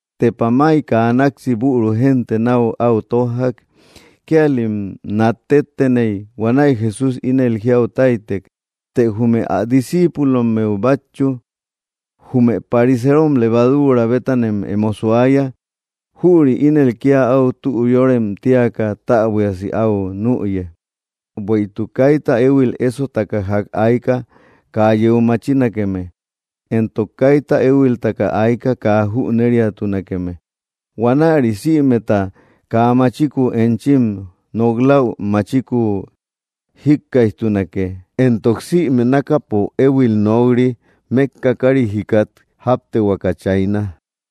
Tepa may kaa náksi büru génte náu áu tójjak. Kíalim nat tétteney. Huanäi Jesús ínel jiau táytek, të jume ä discíipulommeu bátchu: —Jume pariseerom levaduura bétanem emo suaya; jüri ínel kía áu tü yórem tíaka täbuiasi áu nüye. Bueïtuk kaita éhuil ésotaka ják ayka, kaa yeu machinakeme. Éntok kaita éhuiltaka ayka, kaa jüneriatunakeme. Huanäri, sïmeta kaa machiku enchim nok‑läu, machiku jíkkaijtunake. Éntok sïme nákapo éhuil nok‑ri, mékka kárit jikat jáptehuaka chayna.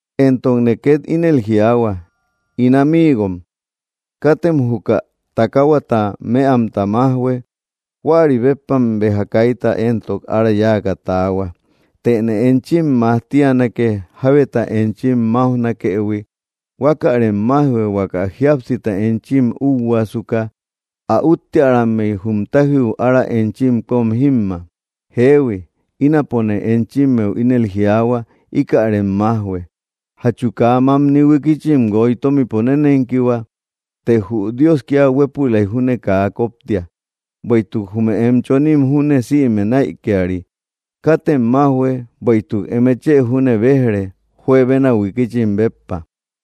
’Éntokne két ínel jiaahua, ín amiigom: Katem juka takahuata mëamta májhue. Huäri béppam béja kaita éntok ára yáaka taahua. Tëne enchim majtianake, jábeta enchim máujnakëhui. Huakärem májhue, huaka jíapsita enchim úhuaasuka, ä úttiarimmea jum tájiu ára enchim kóm jímma. Jeehui, ínapone enchimmeu ínel jiaahua, íkärem májhue. ’¿Jachu kaa mamni huikichim guoy tómipo nénenkihua? Të jü Dios kía huépülai júne kaa koptia. Bueïtuk jume em chonim júne sïme näikiari. Katem májhue, bueïtuk eme chë júne béj‑re, juebena huikichim béppa.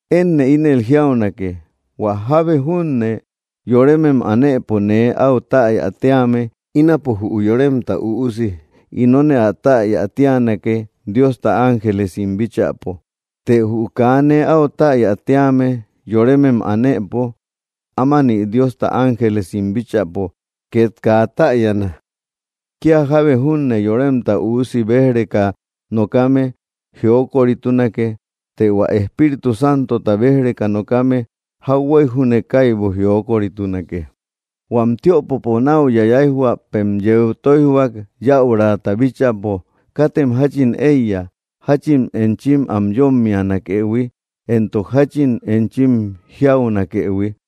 ’Énne ínel jiaunake, hua jábe junne yoremem anëpo nee áu täya tíame, ínapo jü Yoremta Üusi inone ä täya tíanake, Diosta ángelesim bíchäpo, të jü kaa nee áu täya tíame yoremem anëpo, ámani Diosta ángelesim bíchäpo két kaa täyana. ’Kía jábe junne Yoremta Üusi béj‑reka nokame, jiokoritunake. Të hua Espíritu Santota béj‑reka nokame, jauhuey júne kaibu jiokoritunake. ’Huam tiöpopo náu yayaijhuäpem yeu tóijhuak, yäurata bíchäpo, katem jáchin éiya, jáchin enchim am yómmianakëhui, éntok jáchin enchim jiaunakëhui,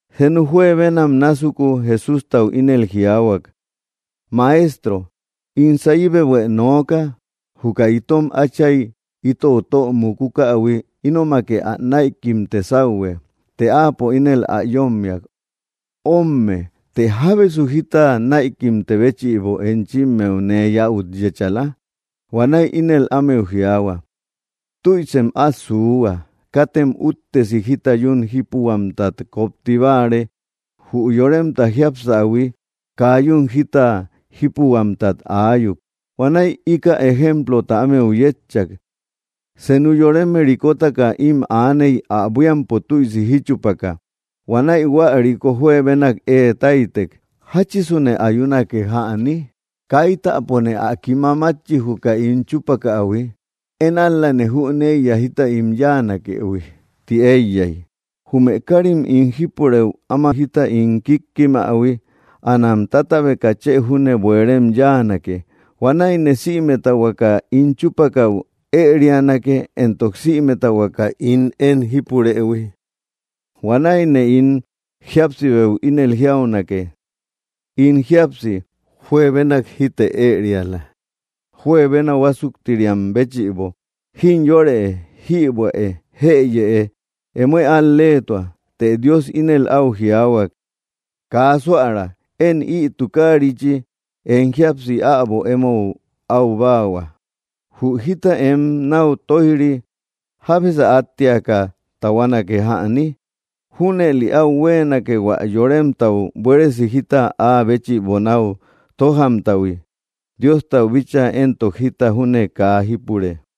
Senu juebenam násuku, Jesústau ínel jiaahuak: —Maestro, ín sayibehuë nooka. Juka itom átchay itou tö mukukähui, ínomake ä näikimte sáuhue. Të áapo ínel ä yómmiak: —Ómme, ¿të jábesu jita näikimte béchïbo enchimmeu nee yäut yéchala? Huanäi ínel ámeu jiaahua: —Tüisem át suuhua. Katem úttesi jita yún jípuhuamtat kopti báare. Jü yoremta jiapsähui kaa yún jita jípuhuamtat aayuk. Huanäi íkäi ejemplota ámeu yétchak: —Senu yoreme rikotaka ím aaney; ä buíampo tüisi jíchupaka. Huanäi hua riko juebenak ée táytek: ‘‘¿Jáchisune ayunake jäni? ¡Kaitäpone ä kima mátchi, juka ín chúpakähui!” ‘‘Én ál‑lane jüneiya jita ín yáanakëhui”, ti éiyak. ‘‘Jume kárim ín jípurëu áma jita ín kíkkimähui, anam tátabeka chë júne bueerem yáanake. Huanäine sïmeta huaka ín chúpakäu ërianake, éntok sïmeta huaka ín én jípurëhui. Huanäine ín jíapsibeu ínel jiaunake: In jíapsi, juebenak jíte ëriala, juebena huásuktiriam béchïbo. Jimyorëe, jïbuäe, jëyëe, emoë al‑leetua.” Të Dios ínel áu jiaahuak: ‘‘¡Kaa suära! Én ï tukaarichi em jíapsi äbo émou aübaahua. Jü jita em náu tóij‑ri, ¿jábesä áttiaka tahuanake jäni?” Júnëli áu huéenake hua yoremtau buéresi jita áa béchïbo náu tójamtahui. Diostau bíchaa éntok, jita júne kaa jípure.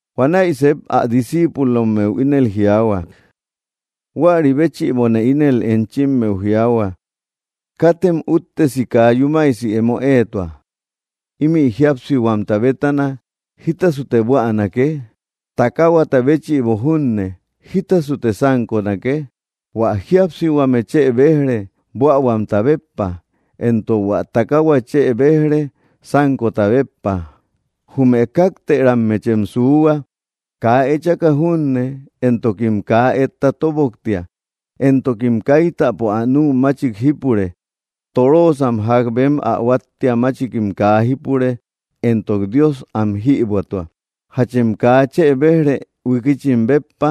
Huanäi sep ä discíipulommeu ínel jiaahuak: —Huäri béchïbone ínel enchimmeu jiaahua: Katem úttesi kaa yúmasi emo éetua: ‘‘Ímï jíapsihuamta bétana, ¿jítasute buänake? ¿Takahuata béchïbo junne, jítasute sánkonake?” Huä jíapsihuame chë béj‑re, buähuamta béppa; éntok hua takahua chë béj‑re, sánkota béppa. Jume kaaktërammechëm suuhua. Kaa ëechaka junne, éntokim kaa etta tobotoboktia. Éntokim kaitapo ä nü machik jípure. Toroosam ják bem ä huáttia machikim kaa jípure, éntok Dios am jïbuätua. ¿Jachem kaa chë béj‑re huikichim béppa?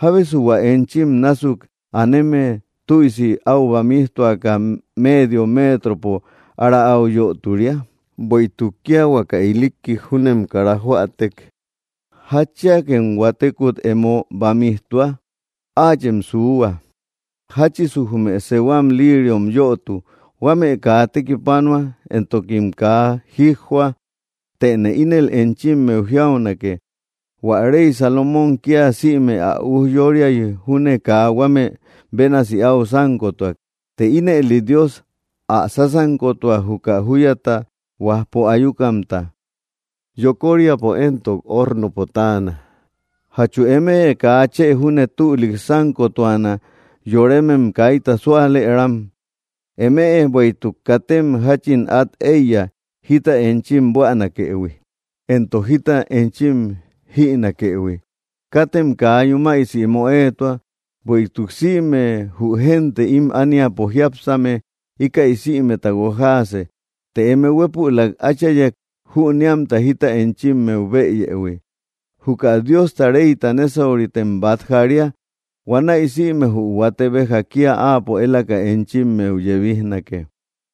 ¿Jábesu hua enchim násuk aneme tüisi áu bamijtuaka méedio metropo ára áu yöturia? Bueïtuk kía huaka ilikkik júnem kara joätek, ¿jatchiakem huatekut emo bamijtua? ’Áachem suuhua, jáchisu jume sehuam líiriom yötu. Huame kaa tekipanua, éntokim kaa jíjjoa. Tëne ínel enchimmeu jiaunake, hua rey Salomón kía sïme ä ujyóriay júne kaa huame bénasi áu sánkotuak. Të ínëli Dios ä sásankotua juka júyata huajpo ayukamta. Yokoríapo éntok ornopo táana. ¿Jachu eme kaa chë júne tülik sánkotuana, yoremem kaita súalëram? Eme, bueïtuk, katem jáchin át éiya, jita enchim buänakëhui, éntok jita enchim jïnakëhui. Katem kaa yúmasi emo éetua. Bueïtuk sïme jü génte ím ániapo jiápsame, íkäi sïmeta guojaase. Të eme huépülak Áchayek, jüneamta jita enchimmeu bëyëhui. Juka Diosta reyta nésauritem bát jaria. Huanäi sïme jü huate béja kía áapo élaka enchimmeu yebijnake.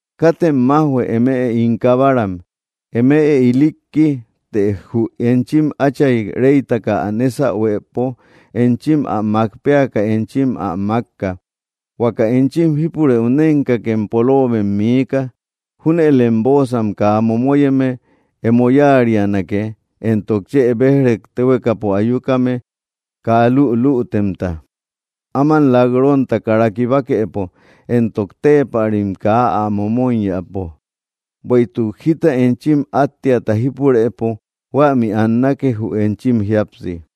’Katem májhue, eme ín kabaram. Eme ilikki, të jü enchim Átchay reytaka ä nésahuepo enchim ä mák péaka enchim ä mákka. Huaka enchim jípurëu nénkakem poloobem miika. Júnëlem bóosam kaa momoyeme emo yáarianake, éntok chë béj‑rek téhuekapo ayukame kaa lülütemta, áman lak‑ronta kara kibakepo, éntok téepärim kaa ä momoiyäpo. Bueïtuk jita enchim áttiata jípurëpo, huämi annake, jü enchim jíapsi.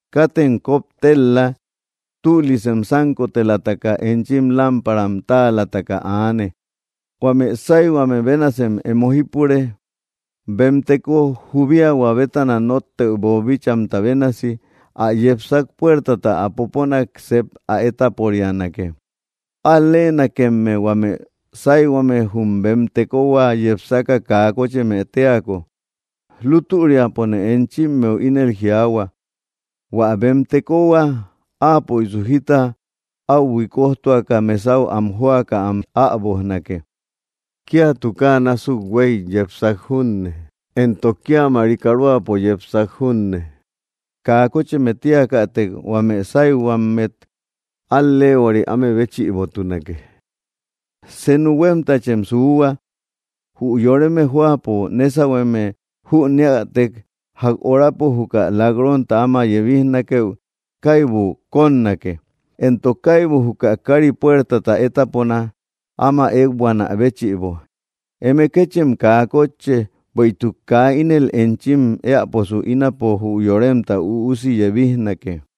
’Katem koptel‑la. Tülisem sánkotelataka, enchim lámparam táalataka aane. Huame sáyhuame bénasem emo jípure, bem teko jubiahua bétana nóttëu boobíchaïhuimta bénasi. Ä yepsak puertata ä poponak sep ä étaporianake. Al‑leenakemme, huame sáyhuame, jü bem tekohua yepsaka kaa kócheme téako. Lútüriapone enchimmeu ínel jiaahua: Huä bem tekohua, áapöisu jita áu huikojtuaka, mesau am jóaka am äbojnake. Kía tukaa násuk huéy yepsak junne, éntok kía marikaroapo yepsak junne, kaa kócheme tíakätek, huame sáyhuamet al‑leehuari áme béchïbotunake. Senu huémtachem suuhua: Jü yoreme jóapo nésahueme jüneätek ják horapo juka lak‑ronta áma yebijnakeu, kaibu kónnake, éntok kaibu juka kári puertata étapona, áma ékbuanä béchïbo. Eme kéchem kaa kótche. Bueïtuk kaa ínel enchim éäposu, ínapo jü Yoremta Üusi yebijnake.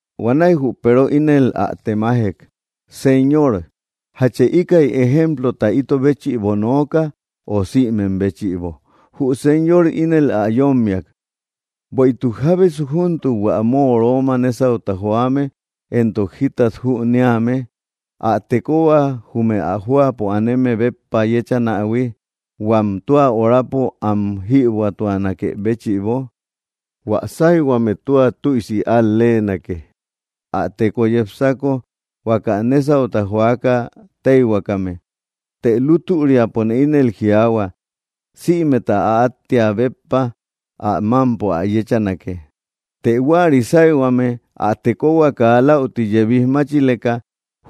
Huanäi jü Peero ínel ä temajek: —Señor, ¿jache íkäi ejemplota ito béchïbo nooka, o sïmem béchïbo? Jü Señor ínel ä yómmiak: —Bueïtuk, ¿jábesu júntuk hua móoroma nésauta joame éntok jitat jüneame, ä tekohua jume ä jóapo aneme béppa yechanähui, huam tua horapo am jïbuätuanakë béchïbo? Huä sáyhuame tua tüisi al-leenake, ä teko yepsako, huaka nésauta joaka téihuakame. Të lútüriapone ínel jiaahua, sïmeta ä áttia béppa ä mámpo ä yéchanake. Të huäri sáyhuame ä tekohua kaa läuti yebij máchileka,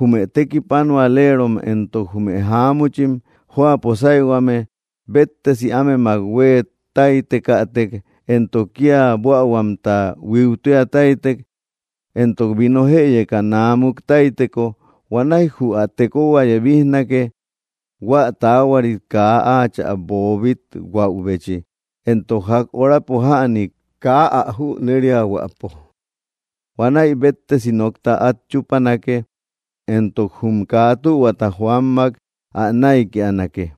jume tekipanualerom éntok jume jáamuchim jóapo sáyhuame béttesi ámemak huée táytekätek, éntok kía buähuamta huíutia táytek, éntok vino jëyeka naamuk táyteko, huanäi jü ä tekohua yebijnake, hua taahuari kaa áachä boobit‑huäubechi, éntok ják horapo jäni kaa ä jüneriahuäpo. Huanäi béttesi nokta át chúpanake, éntok jum kaa tühuata joammak ä näikianake.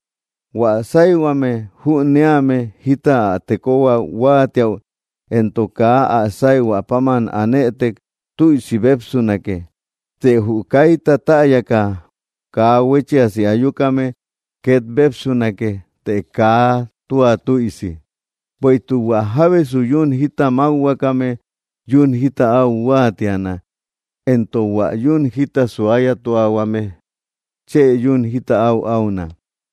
’Huä sáyhuame jüneame jita ä tekohua huáatiäu, éntok kaa ä sáyhuä páman anëtek, tüisi bépsunake. Të jü kaita täyaka kaa huéchiasi ayukame, két bépsunake, të kaa tua tüisi. Bueïtuk hua jábesu yún jita mákhuakame, yún jita áu huáatiana, éntok hua yún jita suayatuahuame, chë yún jita áu auna.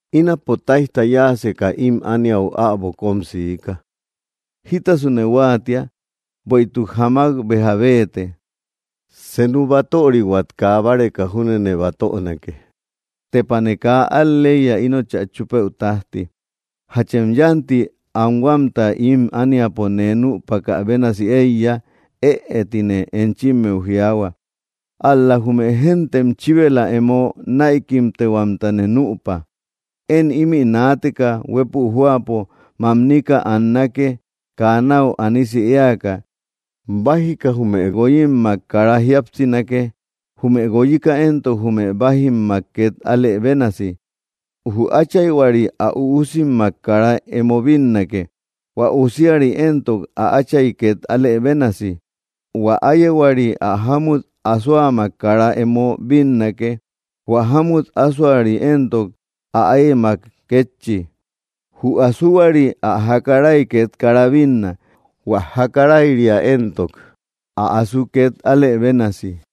’Ínapo táijta yáaseka ím ániau äbo kóm siika. ¿Jítasune huáatia? ¡Bueïtuk jamak béja béete! Senu batörihuat kaa báreka júnene batönake. ¡Tepane kaa al‑leiya inochä chúpëu tájti! ¿Jachem yánti anhuamta ím ániapo nee nüpakä bénasi éiya? Ëe, tine enchimmeu jiaahua. Ál‑la jume géntem chíbela emo näikimtehuamtane nüpa. Én ímï naateka, huépü jóapo mamnika annake, kaa náu anisi éaka. Bájika jume guoyimmak kara jíapsinake, jume guoyika éntok, jume bájimmak két alë bénasi. Jü áchayhuari ä üusimmak kara emo bínnake; hua usiari éntok, ä átchay két alë bénasi. Huä áyehuari ä jámut asoamak kara emo bínnake; hua jámut asoari éntok, ä áyemak kétchi. Jü asuhuari ä jakaray két kara bínna; hua jakarayria éntok, ä asu két alë bénasi.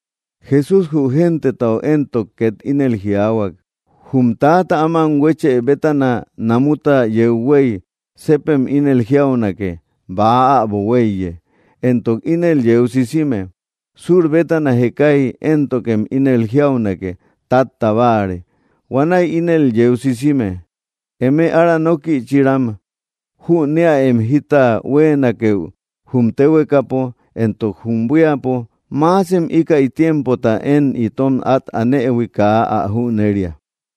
Jesús jü gentetau éntok két ínel jiaahuak: —Jum täata áman huéchë bétana, namuta yeu huéy, sepem ínel jiaunake: ‘‘Bäa äbo huéiye.” Éntok ínel yeu sisime. Sur bétana jekay éntokem ínel jiaunake: ‘‘Tátta báare.” Huanäi ínel yeu sisime. ¡Eme ára nókïchiram! Jüneäem jita huéenakeu jum téhuekapo, éntok jum buíapo. ¿Maasem íkäi tiempota én ito át anëhui kaa ä jüneria?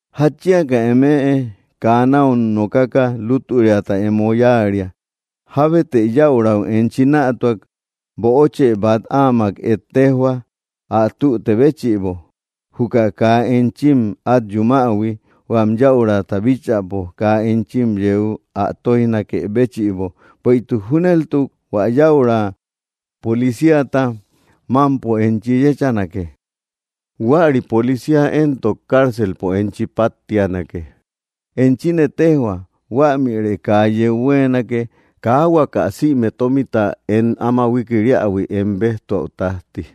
’¿Jatchiaka eme kaa náu nokaka lútüriata emo yáaria? Jábetë yäurau enchi nätuak böochë bát áamak ejtejhua, ä tüte béchïbo, juka kaa enchim át yumähui, huam yäurata bíchäpo kaa enchi yeu ä tóijnakë béchïbo. Bueïtuk júneltuk hua yäura policíata mámpo enchi yéchanake. Huäri policía éntok cárcelpo enchi páttianake. Enchine téjhua, huämirë kaa yeu huéenake, kaa huaka sïme tómita em áma huikiriähui em béjtuäu tájti.